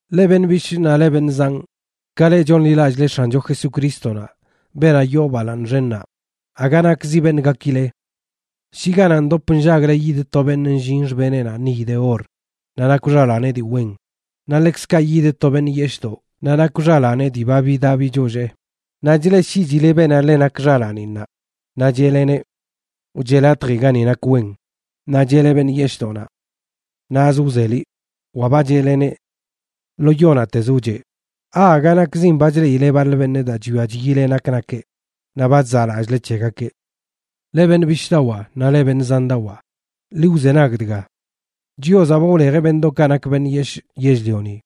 Leꞌ beṉꞌ bishꞌ naꞌ leꞌ beṉꞌ zanꞌ, ka leꞌ chonḻilallꞌle X̱ancho Jesucrístonaꞌ, beenaꞌ yoo balaaṉ xennaꞌ, aga nakzi beṉꞌ gakile. Shi ganaꞌ ndop nllagle yidə to beṉꞌ nllin xbeneꞌnaꞌ niy de or naꞌ nakw xalaaneꞌ dii wen, naꞌ ḻekzkaꞌ yidə to beṉꞌ yeshꞌdoꞌ naꞌ nakweꞌ xalaaneꞌ dii ba bidaꞌ bichollee, naꞌ chleꞌshiꞌchile beenaꞌ ḻe nak xalaaninnaꞌ, naꞌ cheꞌleneꞌ: “Wcheꞌ latji gani nak wen”, naꞌ cheꞌle beṉꞌ yeshꞌdoꞌnaꞌ: “Naꞌzə wze, liꞌ”, wa ba cheꞌleneꞌ: “Lo yo naꞌtezə wcheꞌ”, ¿aaga nakzin ba chleꞌile baḻ beṉꞌ daa chwia chyile nak nakeꞌ, naꞌ ba chzaꞌlallꞌle c̱hegakeꞌ? Leꞌ beṉꞌ bishꞌdawaa naꞌ leꞌ beṉꞌ zandawaa, ḻi wzenag dga: Chiozaꞌ ba wlejeꞌ beṉꞌdoꞌkaꞌ nak beṉꞌ yeshꞌ yell-lioni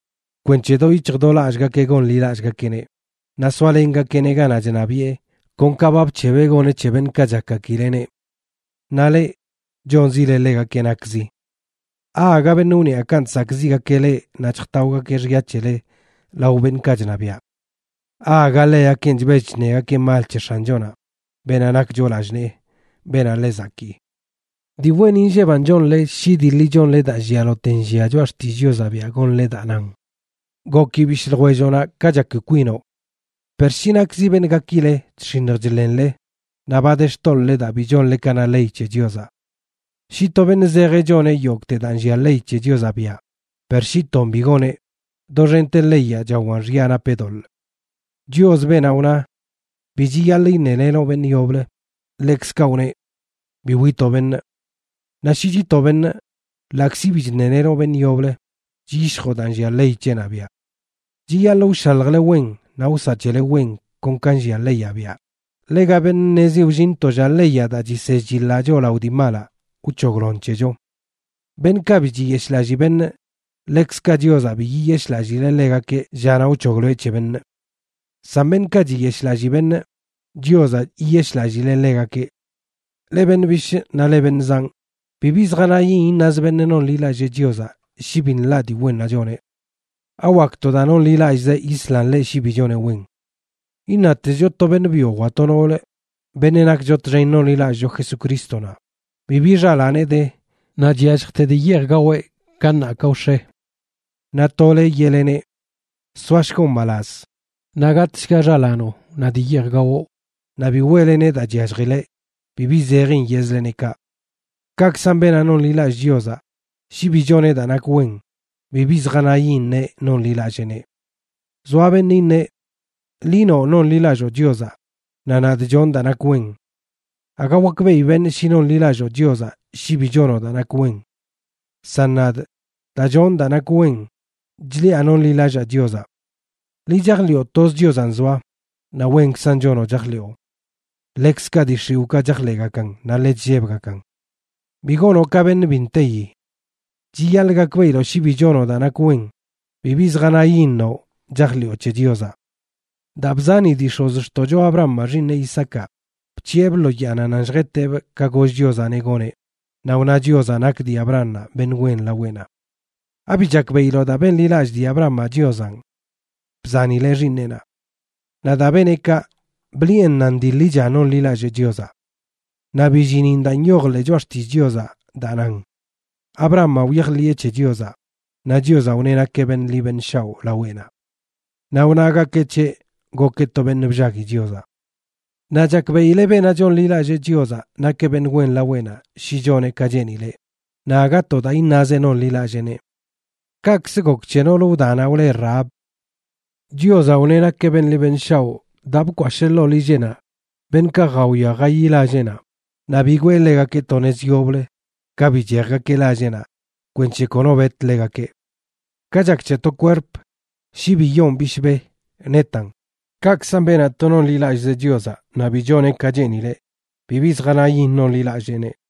kweṉche do yic̱hj do lallꞌgakeꞌ gonḻilallꞌgakeꞌneꞌ naꞌ soalengakeꞌneꞌ ganaꞌ chṉabiꞌe, kon ka ba bc̱hebeꞌ goneꞌ c̱he beṉꞌkaꞌ chakgakileꞌneꞌ. Naꞌ leꞌ, chonzile ḻegakeꞌ nakzi. ¿Aaga beṉꞌ wniaꞌkanꞌ chsakꞌziꞌgakeꞌ leꞌ naꞌ chjtaogakeꞌ xya c̱hele lao beṉꞌkaꞌ chṉabiaꞌ? ¿Aaga ḻegakenꞌ chbell chṉegakeꞌ mal c̱he X̱anchonaꞌ, beenaꞌ nakcho lallꞌ nee, beenaꞌ ḻe zakii? Dii wen inlleban chonle shi dii ḻi chonle daa llialote nllia Choꞌa Xtillꞌ Chiozaꞌ biaꞌ gonle daa nan: “Goki bishꞌ ljwelloꞌnaꞌ ka chaki kwinoꞌ.” Per shi nakzi beṉꞌ gakile, chx̱iṉj chḻenle, naꞌ ba de xtoḻꞌle daa bi chonle ka na ley c̱he Chiozaꞌ. Shi to beṉꞌ zejeꞌ choneꞌ yogꞌte daa nllia ley c̱he Chiozaꞌ biaꞌ, per shi ton bi goneꞌ, doxente leyaꞌ chawan xya napeꞌ doḻꞌ. Chios, beenaꞌ wna: “Bi chiyaḻꞌ iṉelenoꞌ beṉꞌ yoblə”, ḻekzkaꞌ wneꞌ: “Bi witoꞌ beṉꞌ.” Naꞌ shi chitoꞌ beṉꞌ, ḻaꞌkzi bi chṉelenoꞌ beṉꞌ yoblə, chyishjoꞌ daa nllia ley c̱heꞌnaꞌ biaꞌ. Chiyaḻꞌ wshaljle wen naꞌ wsaꞌ c̱hele wen kon ka nllia leyaꞌ biaꞌ, ḻega beṉꞌ ṉezi wllin to lla leyaꞌ daa chisell chiḻaꞌ choꞌ lao dii malaꞌ, wc̱hoglon c̱hecho. Beṉꞌkaꞌ bi chiyeshꞌlallii beṉꞌ, ḻekzkaꞌ Chiozaꞌ bi yiyeshꞌlallileꞌ ḻegakeꞌ llanaꞌ wc̱hogloeꞌ c̱he beṉꞌ. San beṉꞌkaꞌ chiyeshꞌlallii beṉꞌ, Chiozaꞌ yiyeshꞌlallileꞌ ḻegakeꞌ. Leꞌ beṉꞌ bishꞌ naꞌ leꞌ beṉꞌ zanꞌ, bibi zjanayin iṉaz beṉꞌ nonḻilallee Chiozaꞌ shi bi nḻaꞌ dii wennaꞌ choneꞌ. ¿Awak to daa nonḻilallꞌzeꞌ yislan ḻeꞌ shi bi choneꞌ wen? Iṉatezcho to beṉꞌ byo wa to noolə, beṉꞌ nakcho txen nonḻilallꞌcho Jesucrístonaꞌ, bibi xalaaneꞌ de naꞌ chyalljte dii yeej gaweꞌ ka ṉaa ka wx̱e. Naꞌ tole yeꞌleneꞌ: “Soashgoꞌ mbalaz, naꞌ gatꞌshga xalaanoꞌ naꞌ dii yeej gawoꞌ”, naꞌ bi weꞌleneꞌ daa chyalljileꞌ, bibi zejin yeꞌzleneꞌ kaꞌ. Kaꞌkzan beenaꞌ nonḻilallee Chiozaꞌ, shi bi choneꞌ daa nak wen, bibi zjanayin neꞌ nonḻilalleeneꞌ. Zoa beṉꞌ iṉeꞌ: “Liꞌ noꞌ nonḻilalloo Chiozaꞌ, naꞌ nadꞌ chonꞌ daa nak wen. Aga wakbeꞌi beṉꞌ shi nonḻilalloo Chiozaꞌ shi bi chonoꞌ daa nak wen. San nadꞌ, daa chonꞌ daa nak wen chliꞌa nonḻilallaa Chiozaꞌ.” Liꞌ chajḻiꞌo toz Chiozanꞌ zoa, naꞌ wenkzan chonoꞌ chajḻiꞌo. Ḻekzkaꞌ dii xiwꞌkaꞌ chajḻeꞌgakan naꞌ ḻe chllebgakan. Bi gonoꞌ ka beṉꞌ bi nteyi. Chiyaḻꞌ gakbeꞌiloꞌ shi bi chonoꞌ daa nak wen, bibi zjanayin noꞌ chajḻiꞌo c̱he Chiozaꞌ. Daa bzani dii x̱ozxtoꞌcho Abrahamaꞌ xiiṉeꞌ Isaacaꞌ, bc̱hiꞌebꞌ lo yaanaꞌ nan lljeteꞌbꞌ ka goll Chiozaꞌneꞌ goneꞌ, naꞌ wna Chiozaꞌ nak dii Abrahamaꞌ beṉꞌ wen laweꞌnaꞌ. ¿Abi chakbeꞌiloꞌ daa benḻilallꞌ dii Abrahamaꞌ Chiozanꞌ, bzanileꞌ xiiṉeꞌnaꞌ? Naꞌ daa beneꞌ kaꞌ, bliꞌen nan dii ḻicha nonḻilallee Chiozaꞌ. Naꞌ billinin daa nyoj ḻee Choꞌa Xtillꞌ Chiozaꞌ daa nan: “Abrahamaꞌ wyajḻiꞌe c̱he Chiozaꞌ, naꞌ Chiozaꞌ wneꞌ nakeꞌ beṉꞌ ḻi beṉꞌ shaoꞌ laweꞌnaꞌ.” Naꞌ wnagakeꞌ c̱heꞌ gokeꞌ to beṉꞌ bllagui Chiozaꞌ. Naꞌ chakbeꞌile beenaꞌ chonḻilallee Chiozaꞌ nakeꞌ beṉꞌ wen laweꞌnaꞌ shi choneꞌ ka cheenileꞌ, naꞌ aga to daa iṉazeꞌ nonḻilalleeneꞌ. Kaꞌkzə gok c̱he noolə wdanaꞌ wle Rahab. Chiozaꞌ wneꞌ nakeꞌ beṉꞌ ḻi beṉꞌ shaoꞌ daa bkwashee ḻoo lilleꞌnaꞌ beṉꞌkaꞌ jawia jayi lalleꞌnaꞌ, naꞌ bigwee ḻegakeꞌ to nez yoblə ka bichejgakeꞌ lalleꞌnaꞌ kwenc̱he kono bet ḻegakeꞌ. Ka chak c̱he to kwerp, shi bi yoon bishbe, netan, kaꞌkzan beenaꞌ to nonḻilallꞌzeꞌ Chiozaꞌ naꞌ bi choneꞌ ka cheenileꞌ, bibi zjanayin nonḻilalleeneꞌ.